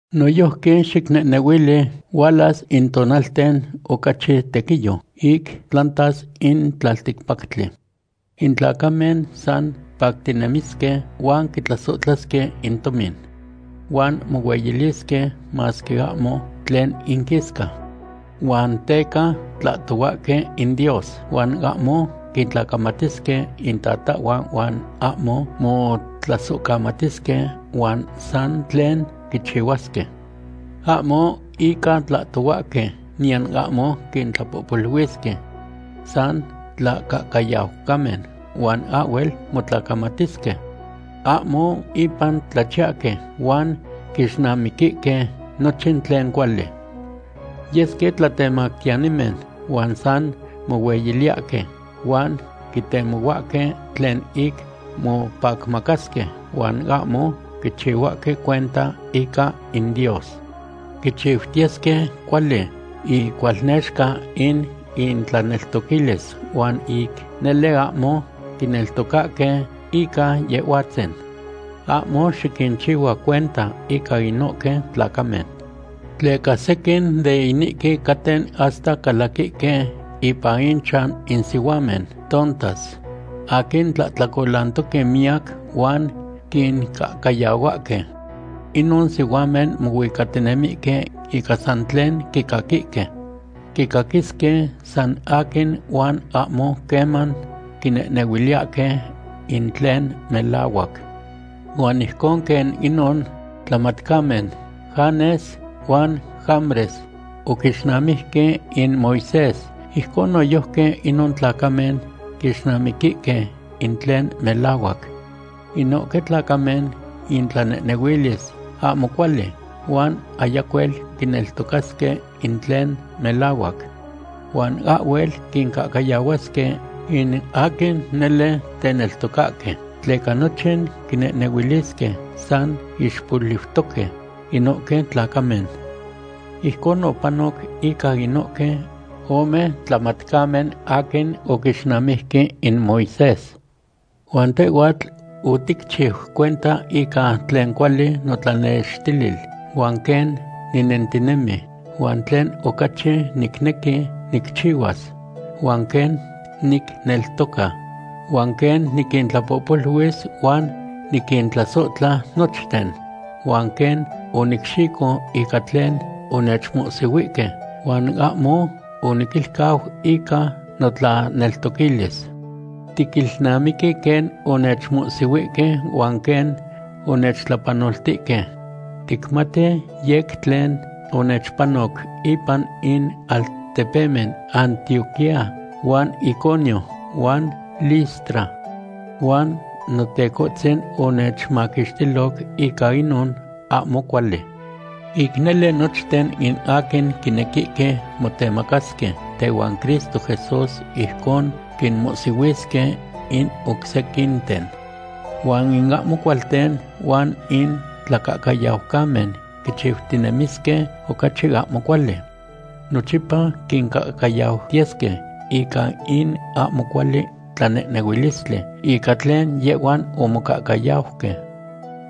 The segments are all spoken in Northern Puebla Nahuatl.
Noyojqui xicnehnehuili hualas in tonalten ocachi tequiyo ic tlantas in tlalticpactli. In tlacamen san pactinemisque huan quitlasohtlasque in tomin. Huan mohueyilisque masque ahmo tlen inquisca. Huan teca tlahtohuahque in Dios huan ahmo quintlacamatisque intata huan ahmo motlasohcamatisque huan san tlen quichihuasque. Ahmo ica tlocoyahque niyan ahmo quintlapohpoluilisque. San tlacahcayaucamen huan ahhuel motlacamatiltisque. Ahmo ipan tlachiyahque huan quixnamiquihque nochin tlen cuali. Yesque tlatemactiyanimen huan san mohueyiliyahque huan quitemohuahque tlen ic mopacmacasque huan ahmo quichihuahque cuenta ica in Dios. Quichiutiyesque cuali icualnexca in intlaneltoquilis huan ic nele ahmo quineltocahque ica Yehhuatzin. Ahmo xiquinchihua cuenta ica inohque tlacamen. Tleca sequin de inihque caten hasta calaquihque ipan inchan in sihuamen tontas aquin tlahtlacolantoque miyac huan quincahcayahuahque. Inon sihuamen mohuicatinemihque ica san tlen quicaquihque. Quicaquisque san aquin huan ahmo queman quinehnehuiliyahque in tlen melahuac. Huan ijcon quen inon tlamatcamen Janes huan Jambres oquixnamiqui in Moisés, ijcon noyojqui inon tlacamen quixnamiquihque in tlen melahuac. Inohque tlacamen intlanehnehuilis ahmo cuali huan ayacuel quineltocasque in tlen melahuac. Huan ahhuel quincahcayahuasque in aquin nele teneltocahque, tleca nochin quinehnehuilisque san ixpoliutoque inohque tlacamen. Ijcon opanoc ica inohque ome tlamatcamen aquin oquixnamijque in Moisés. Huan tehhuatl oticchiu cuenta ica tlen cuali notlanextilil huan quen ninentinemi, huan tlen ocachi nicnequi nicchihuas, huan quen nicneltoca, huan quen niquintlapohpoluis huan niquintlasohtla nochten, huan quen onicxico ica tlen onechmohsihuihque huan ahmo oniquilcau ica notlaneltoquilis. Tiquilnamiqui quen onechmohsihuihque huan quen onechtlapanoltihque. Ticmati yec tlen onechpanoc ipan in altepemen Antioquía huan Iconio huan Listra. Huan Notecohtzin onechmaquixtiloc ica inon ahmo cuali. Ic nele nochten in aquin quinequihque motemacasque tehuan Cristo Jesús ijcon quinmohsihuisque in oc sequinten. Huan in ahmo cualten huan in tlacahcayaucamen quichiutinemisque ocachi ahmo cuali. Nochipa quincahcayautiyesque ica in ahmo cuali tlanehnehuilistli ica tlen yehhuan omocahcayauque.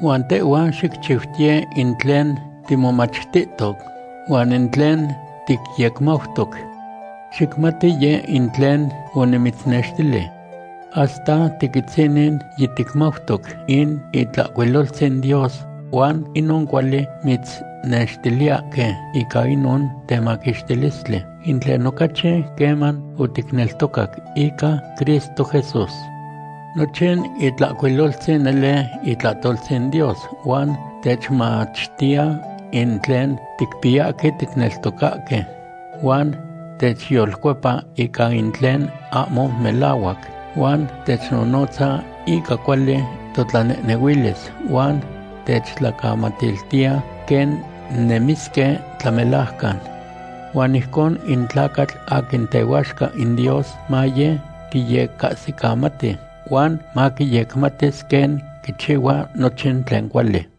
Huan tehhua xicchiutiye in tlen timomachtihto, huan in tlen ticyecmautoc. Xicmati yeh in tlen onimitznextili. Hasta tiquitzinin yiticmautoc in Itlahcuiloltzin Dios huan inon cuali mitznextiliyahque ica inon temaquixtilistli, in tlen oticahsic queman oticneltocac ica Cristo Jesús. Nochin Itlahcuiloltzin nele itlahtoltzin Dios huan techmachtiya in tlen ticpiyahque ticneltocahque huan techyolcuepa ica in tlen ahmo melahuac, huan technonotza ica cuali totlanehnehuilis, huan techtlacamatiltiya quen nemisque tlamelajcan. Huan ijcon in tlacatl aquin tehuaxca in Dios maye quiyecahsicamati, huan maquiyecmatis quen quichihuas nochin tlen cuali.